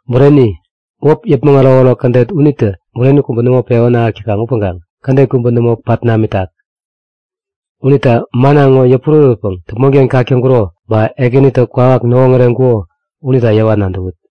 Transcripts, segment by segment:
Bureni, wäp yäpmäŋ ärokärok kädet unitä bureni kubä nämo pewän ahäk täkaŋ upäŋkaŋ kädet kubä nämo pat namitak. Unita manna ŋo yäpurärätpäŋ däpmonken kak täŋkuro ba Ekänitä kwawak näwoŋäreŋkuko unita yäwa nadäwut;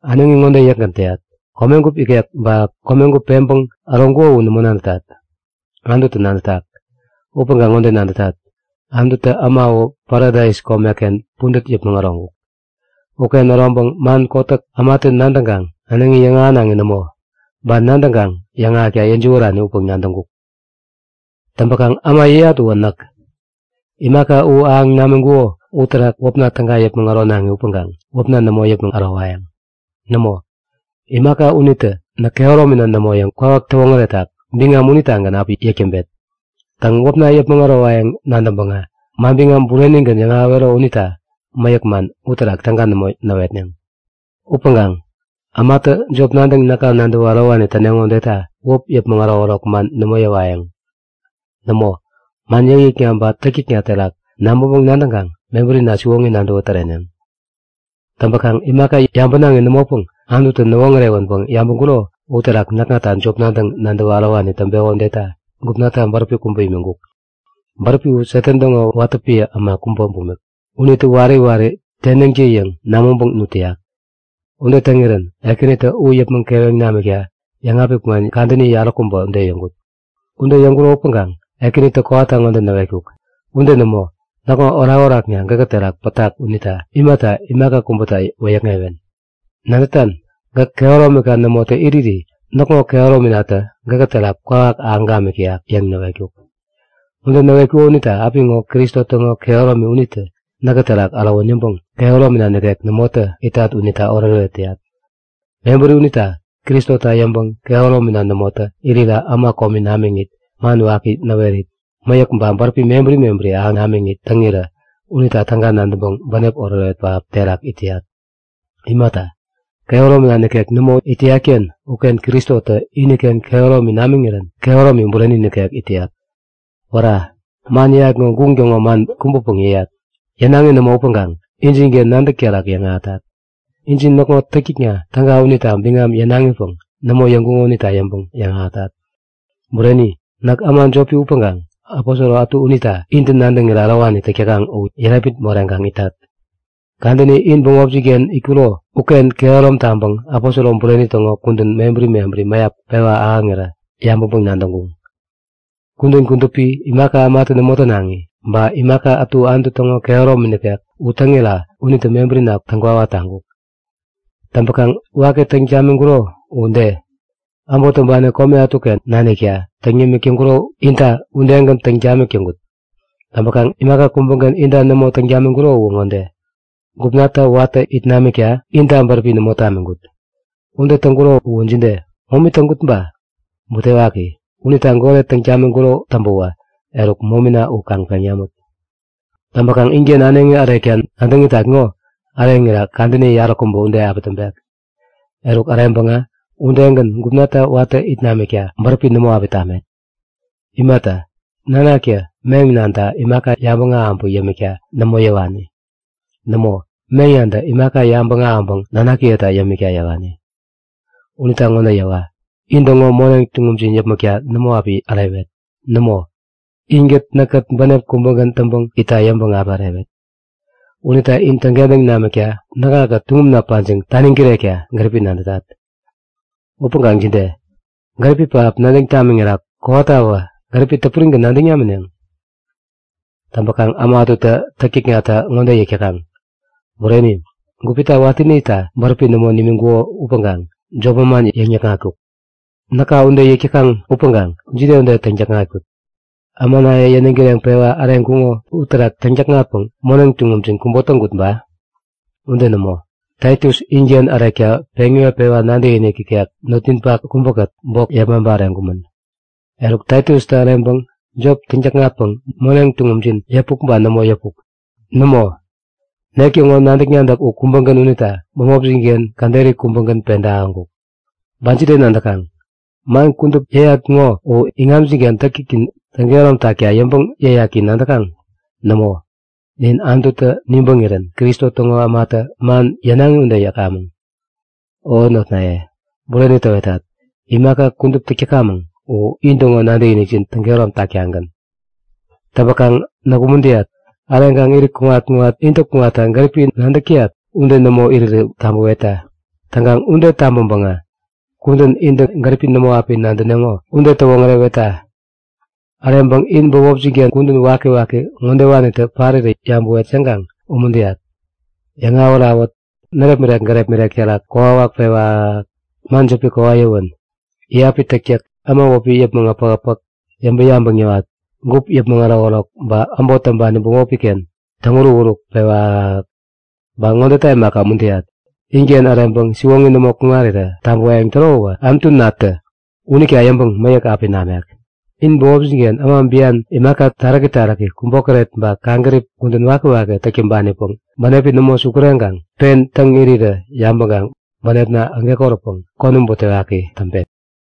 Äneŋi ŋode yäkgän täyat; Komegup ikek ba komegup peŋpäŋ äroŋkuko u nämo nadätat. Anututä nadätak. Upäŋkaŋ ŋode nadätat; Anututä äma uwä Paradais komeken pudät yäpmäŋ äroŋkuk. Uken äroŋpäŋ man kotäk ämatä nadäŋkaŋ äneŋi yäŋahänaŋi nämo, ba nadäŋkaŋ yäŋahäkta yäjiwärani upäŋ nadäŋkuk. Täŋpäkaŋ äma yäyat uwä näk. Imaka u ahäŋ namiŋkuko uterak wäpna täga yäpmäŋ äronaŋi upäŋkaŋ wäpna nämo yäpmäŋ ärowayäŋ. Nämo, imaka unitä näk kehäromina nämo yäŋ kwawak täwoŋäretak biŋam unitagän api yäk täŋpet. Täŋ, wäpna yäpmäŋ ärowayäŋ nadäŋpäŋä manbiŋam burenigän yäŋahäwero unita mäyäk man uterak täga nämo näwetneŋ. Upäŋkaŋ ämatä jop nadäŋ näka nadäwä ärowani täneŋo udeta wäp yäpmäŋ ärokärok man nämo yäwayäŋ. Nämo, man yäkyäkna ba täktäkna terak nabäŋpäŋ-nadäŋkaŋ mebärina siwoŋi nadäwä täreneŋ. Täŋpäkaŋ imaka yabänaŋi nämopäŋ Anututä näwoŋärewänpäŋ yabäŋkuro uterak näkŋata jop nadäŋ nadäwa ärowani täŋpeko udeta gupnata bäräpi kubä imiŋkuk. Bäräpi u Satan täŋo watä piä äma kubä bumik. Unitä wari wari tenäŋtä-yäŋ namäŋpäŋ nut täyak. Ude täŋirän Ekänitä u yäpmäŋ keweŋ namikta yäŋapik man kadäni yaräkubä ude yäŋkut. Ude yäŋapiŋkuro upäŋkaŋ Ekänitä kowata ŋode näwetkuk; Ude nämo. Näkŋo orakorakna gäkä terak pätak unita imata imaka kubäta wäyäkŋewen? Nadätan? Gäk kehäromika nämotä iriri näkŋo kehärominatä gäkä terak kwawak ahäŋ gamik täyak yäŋ näwetkuk. Ude näwetkuko unita apiŋo Kristo täŋo kehäromi unitä näkä terak ärowän yäŋpäŋ kehäromina nikek nämotä itat unita oretoret täyat. Mebäri unita Kristota yäŋpäŋ kehäromina nämotä irira äma komi namiŋit, man waki näwerit, mäyäk ba bäräpi mebäri mebäri ahäŋ namiŋit täŋirä unita täga nadäŋpäŋ bänep oretoret pähap terak it täyat. Imata, kehäromina nikek nämo it täyat-ken uken Kristotä iniken kehäromi namiŋirän kehäromi bureni nikek it täyat. Wära! Man yäyat ŋo guŋ täŋo man kubäpäŋ yäyat. Yänaŋi nämo upäŋkaŋ injinken nadäk terak yäŋahätat. Injin näkŋo täktäkna täga unita biŋam yänaŋipäŋ nämo yäŋkuŋo unita yäŋpäŋ yäŋahätat. Bureni, näk äma jopi upäŋkaŋ aposoro ätu unita intä nadäŋirä ärowani täk täkaŋ u yärepmit moreŋkaŋ itat. Kadäni in bämopjin-ken itkuro uken kehärom taŋpäŋ aposoro bureni täŋo kudän mebäri mebäri mäyap pewa ahäŋirä yabäŋpäŋ-nadäŋkuŋ. Kudän kudupi, imaka ämatä nämo tänaŋi, ba imaka ätu Anutu täŋo kehäromi nikek u täŋira unitä mebärina täŋkwawa taŋkuk. Täŋpäkaŋ waki täŋ tamiŋkuro u de? Äbot täŋpani kome ätuken nanikta täŋ yämik täŋkuro inta udegän täŋ tamik täŋkut. Täŋpäkaŋ imaka kubägän inta nämo täŋ tamiŋkuro u ŋode; Gupnata watä it namikta inta bäräpi nämo tamiŋkut. Ude täŋkuro uwä jide? Momi täŋkut ba? Butewaki, unita goret täŋ tamiŋkuro täŋpäwä eruk momina u kaŋ peŋ namut! Täŋpäkaŋ inken äneŋi ärekta nadäŋ itat ŋo äreŋira kadäni yaräkubä ude api täŋpek. Eruk äreŋpäŋä udegän gupnata watä it namikta bäräpi nämo api tamet. Imata, nanaktä meŋ-nanta imaka yabäŋ ahäŋpäŋ yämikta nämo yäwani. Nämo, meŋ-nantä imaka yabäŋ ahäŋpäŋ nanakiyeta yämikta yäwani. Unita ŋode yäwa; In-täŋo moneŋ tuŋumjin yäpmäkta nämo api ärewet. Nämo, inkät näkkät bänep kubägän täŋpäŋ itta yäŋpäŋ api ärewet. Unita in täŋkentäŋ tamikta näkŋakät tuŋumna pajiŋ taniŋ kirekta gäripi nadätat. Upäŋkaŋ jide? Gäripi pähap nadäŋ tamiŋira kowatawä gäripi täpurigän nadäŋ namineŋ? Täŋpäkaŋ äma ätutä täktäknata ŋode yäk täkaŋ; Bureni, gupita watäni itta bäräpi nämo nimiŋkuko upäŋkaŋ jop manman yäŋnikŋatkuk. Näka ude yäk täkaŋ upäŋkaŋ jide ude täŋ-täkŋatkut? Ämanaye yäniŋ kireŋpewa äreŋkuŋo uterak täŋ-täkŋatpäŋ moneŋ tuŋumjin kubo täŋkut ba? Ude nämo! Taitus inken ärekta peŋ iwetpäŋ nadäkinik ikek notninpak kubäkät bok yepmaŋpa äreŋkumän. Eruk, Taitustä äreŋpäŋ jop täŋ-täkŋatpäŋ moneŋ tuŋumjin yäpuk ba nämo yäpuk? Nämo! Nek täŋo nadäk-nadäk u kubägän unita bämopjin-ken käderi kubägän peda ahäŋkuk. Ba jide nadäkaŋ? Man kudup yäyat ŋo u in iŋamjin-ken täktäknin u täŋkehärom takta yäŋpäŋ yäyak yäŋ nadäkaŋ? Nämo, nin Anututä nibäŋirän Kristo täŋo ämatä man yänaŋi ude yäkamäŋ. O notnaye, bureni täwetat; Imaka kudup täk täkamäŋ u intäŋo nadäkinikjin täŋkehärom taktagän. Täŋpäkaŋ näk umuntäyat. Äreŋkaŋ irit kuŋat-kuŋat intä kuŋatta gäripi nadäk täyat ude nämo irirä tabäwetta. Täŋkaŋ ude tabäŋpäŋä kudän intä gäripi nämo api nadäneŋo ude täwoŋärewetta! Äreŋpäŋ in bämopjin-ken kudän wakiwaki ŋodewanitä parirä yabäwet yäŋkaŋ umuntäyat; Yäŋawät-awät, närepmirek-gärepmirek terak kokwawak pewä ahäk-ahäk, man jäpi kowat-yäwän, iyapi täktäk, äma wäpi yäpmäŋ äpäk-äpäk, yäŋpäŋ-yabäŋ yäwat, gup yäpmäŋ ärokärok ba äbot täŋpani bämopi-ken täŋuruk-uruk pewä ahäk-ahäk. Ba ŋodeta imaka, umuntäyat; Inken äreŋpäŋ siwoŋi nämo kuŋarirä tabäwayäŋ täro uwä Anutunatä unita yäŋpäŋ mäyäk api namek. In bämopjin-ken äma bian, imaka taräki taräki, kubokäret ba kaŋgärip kudän wakiwaki täk täŋpanipäŋ bänepi nämo sukureŋkaŋ pen täŋ irirä yabäŋkaŋ bänepna ägekoräpäŋ konäm butewaki täŋpet.